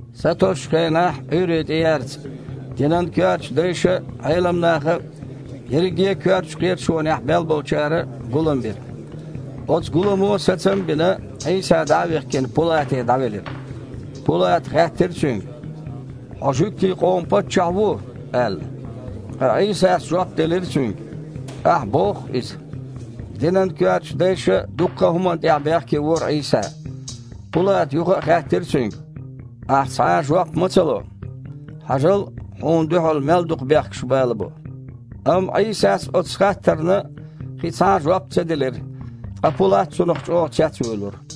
Сатосучу хенахь, Іуьйре тІеярца, динан коьртачу дайша а, Іелам наха а, ерриге а коьртачу кхеташонехь мел болчара а гулам бира. Оцу гуламо, сацам а бина, Іийса дІа а вихкина, Пулате дІавелира. Пулата хаьттира Цуьнга: «Хьо жуьгтийн къоман Паччахь ву?» – аьлла. Ткъа Іийсас жоп делира цуьнга: «Ахь боху-кх иза». Динан коьртачу дайша дуккха а хІуманна тІехь бехке вора Іийса. Пулата юха а хаьттира Цуьнга: «Ахь цхьа а жоп ма ца ло? Хьажал, Хьуна дуьхьал мел дукха бехкаш балабо». Амма Іийсас оцу хаттарна кхин цхьа а жоп ца делира, ткъа Пулат цунах чІогІа цецвуьйлура.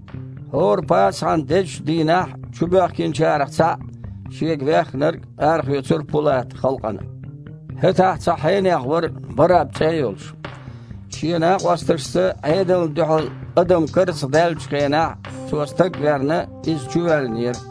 ХІора Пасахьан дезачу дийнахь чубоьхкинчарах цхьаъ, шега веххнарг, арахоьцура Пулата халкъана. ХІетахь цхьа хьенех вара, Барраб цІе а йолуш. Шен накъосташца Іедална дуьхьал адам карзахдаьллачу хенахь, цо стаг верна, иза чувоьллинера.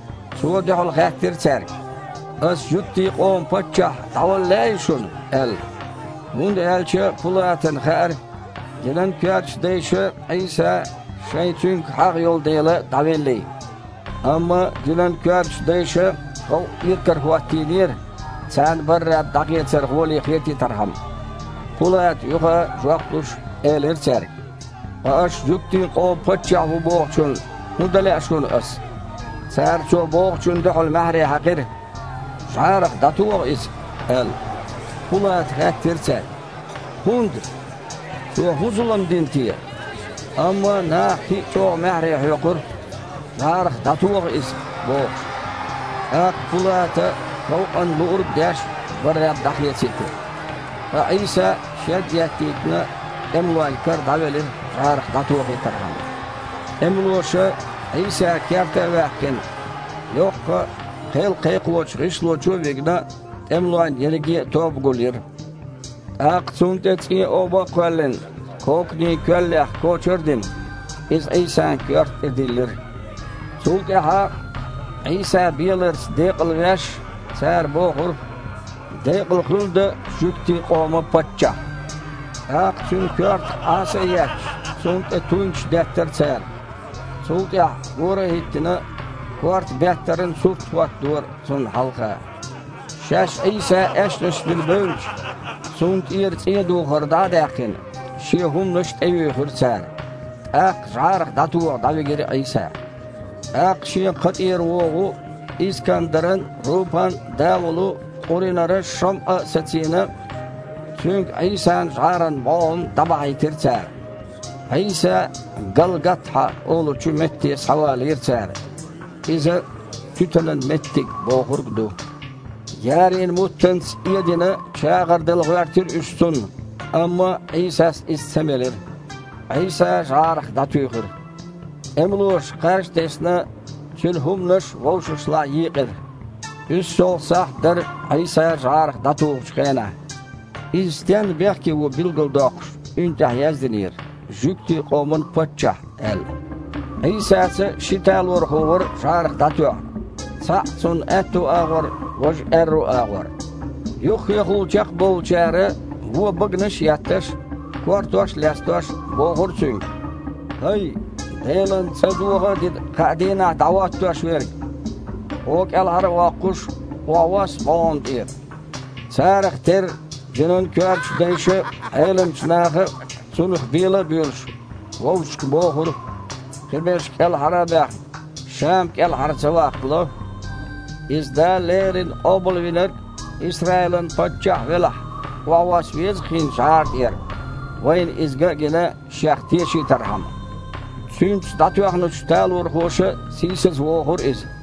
Цо дуьхьал хаьттира цаьрга: «Ас жуьгтийн къоман Паччахь дІавала лаьий шуна?» – аьлла. ХІунда аьлча Пулатана хаьара, динан коьртачу дайша Іийса шайн Цуьнга хьагІ йолу дела дІавеллий. Амма динан коьртачу дайша халкъ иракарахІоттийнера, царна Барраб дІахецар гІоле хетийтархьама. Пулата юха а, жоп луш, элира цаьрга: «Ткъа аш жуьгтийн къоман Паччахь ву бохучунна хІун дан лаьа шуна ас?» Цара цо бохучунна дуьхьал маьхьарий хьаькхира: «ЖІарах дІатоха Иза!» – аьлла. Пулата хаьттира цаьрга: «ХІунда? Цо хІун зулам дина те?» Амма наха кхин а чІогІа маьхьарий хьоькхура: «ЖІарах дІатоха Иза!» – бохуш. ТІаккха Пулата, халкъана луург а деш, Барраб дІахецийтира. Ткъа Іийса, шед а еттийтина, тІемалойн кара дІавелира жІарах дІатохийтархьама. ТІемалоша, Іийса керта а ваьккхина, йоккха, кхел кхайкхочу гІишло чу а вигна, тІемалойн ерриге а тоба гулйира. ТІаккха Цунна тІе цІен оба а кхоьллина, коканийн коьллех кочар а дина, иза Іийсан коьрта тІе диллира. Цул тІаьхьа, Іийса беларца «декъалвеш», цара бохура: «Декъала хуьлда жуьгтийн къоман Паччахь!» ТІаккха Цуьнан коьртах Іаса а етташ, Цунна тІе туйнаш деттара цара. Цул тІаьхьа, гора а хІиттина, корта беттаран сурт хІоттадора Цунна хьалха. Шаьш Іийса аьшнаш вина бевлча, Цунна тІера цІен духар дІа а даьккхина, Шен хІуманаш тІеюьйхира цара. ТІаккха жІарах дІатоха дІавигира Іийса. ТІаккха шен кха тІера вогІу, Искандаран а, Рупан а да волу Къуринара ШамІа а сацийна, цуьнга Іийсан жІаран бІогІам дІабахьийтира цара. Іийса «Галгатхьа» олучу метте схьавалийра цара (иза «туьтанан меттиг» бохург ду). Ярийн муттанца эдина чагІар дала гІоьртира уьш Цунна, амма Іийсас иза ца мелира. Іийса жІарах дІатуьйхира. ТІемалоша, кхаж а тесна, Цуьнан хІуманаш вовшашлахь йийкъира. УьссалгІа сахьт дара Іийса жІарах дІатухучу хенахь. Иза стенна бехке ву билгалдоккхуш, уьнна тІехь яздинера: «Жуьгтийн къоман Паччахь», – аьлла. Іийсаца ши талорхо вара жІарах дІатоьхна, цхьаъ Цунна аьтту агІор, важа аьрру агІор. Юххехула чекхбовлучара, вон баганаш а етташ, кортош а лестош, бохура Цуьнга: «ХІай! Делан цІа доха а дина, кхаа дийнахь дІахІоттош верг! Хьуо кІелхьара а воккхуш, охьавосса бІогІам тІера». Царах терра динан коьртачу дайша а, Іеламчу наха а, Цунах бела а боьлуш, вовшашка бохура: «Кхиберш кІелхьара а баьхна, Ша-м кІелхьара ца ваккхало! Иза Дала леррина Къобалвинарг а, Исраилан Паччахь а велахь, охьавосса веза-кх хІинца жІара тІера, вайна иза ган а гина, Шех тешийтархьама». Цуьнца дІатоьхначу талорхоша а сийсазвохура Иза.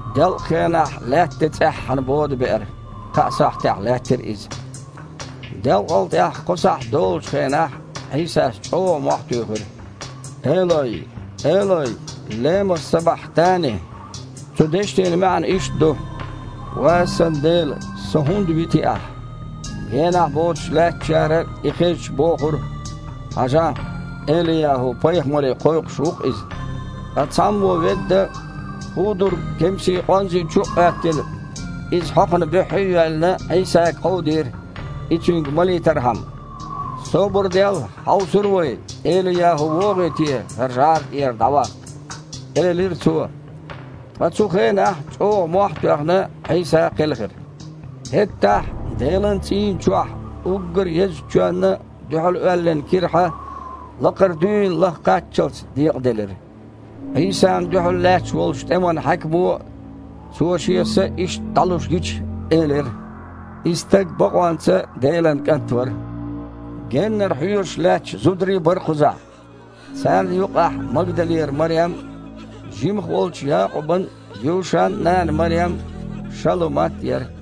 Делкъахенахь лаьтта тІе цІеххьана бода беара, кхаа сахьтехь лаьттира иза. Делкъал тІаьхьа кхо сахьт долучу хенахь, Іийсас чІогІа мохь туьйхира: «Элой, Элой, лема сабахьтани?» Цу дешнийн маьІна иштта ду: «Ва Сан Дела! Со хІунда вити Ахь?» Генахь боцуш лаьттачара, и хезча, бохура: «Хьажахь, Эли-ЯхІу-пайхамаре кхойкхуш ву-кх И». Ткъа цхьаммо ведда, худург кемсийн къонзи чу а Іоьттина, иза хьокхана буьххье а йоьллина, Іийсага кховдийра, и Цуьнга малийтархьама. «Собар дел, хьовсур ду вай, Эли-ЯхІу вогІий те ХІара жІаран тІера дІаваккха», – элира цо. Ткъа цу хенахь, чІогІа мохь а тоьхна, Іийса кхелхира. ХІеттахь Делан цІийнан чохь, уггар езачу чоьнна дуьхьал оьллина кирхьа лакхара дуьйна лаха кхаччалц декъаделира. Іийсана дуьхьал лаьтташ волчу тІеман хьаькамо, Цо Шен са иштта дІалуш гича, элира: «И стаг бакъонца Делан КІант вара». Геннара хьоьжуш лаьтташ зударий а бара кхузахь: царна юкъахь Магдалера Марем а, жимаха волчу Якъубан а, Юшан а нана Марем а, Шалумат а яра.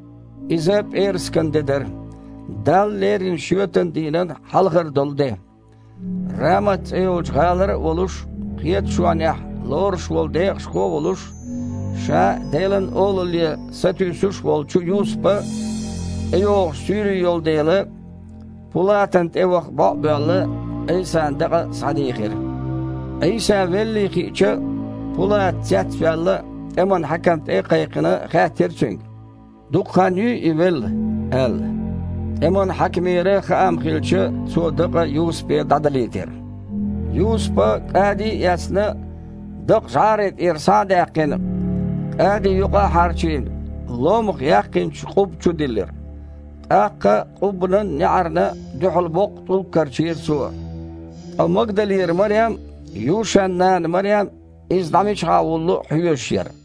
Иза пІераскан де дара, Далла лерина шоьтан дийнан хьалхара долу де. Рамат цІе йолчу гІалара а волуш, кхеташонехь лоруш волу декъашхо а волуш, ша а Делан Олалле сатуьйсуш а волчу Юсупа, тІейогІуш суьйре йолу дела, Пулатана тІе ваха бІо а боьлла, Іийсан дакъа схьадийхира. Іийса веллий хиъча, Пулата, цецваьлла, тІеман хьаькам тІе а кхайкхина, хаьттира цуьнга: «Дукха хан юй И велла?» – аьлла. ТІеман хьаькамера хаам хилча, цо дакъа Юсупе дІадалийтира. Юсупа, кІади а эцна, дакъа, жІара тІера схьа а даьккхина, кІади юкъа а хьарчийна, ломах яьккхинчу къубба чу диллира. ТІаккха къуббанан неІарна дуьхьал боккха тІулг карчийра цо. Ткъа Магдалера Марем а, Юшан нана Марем а Иза дІа мичахьа вуллу хьоьжуш яра.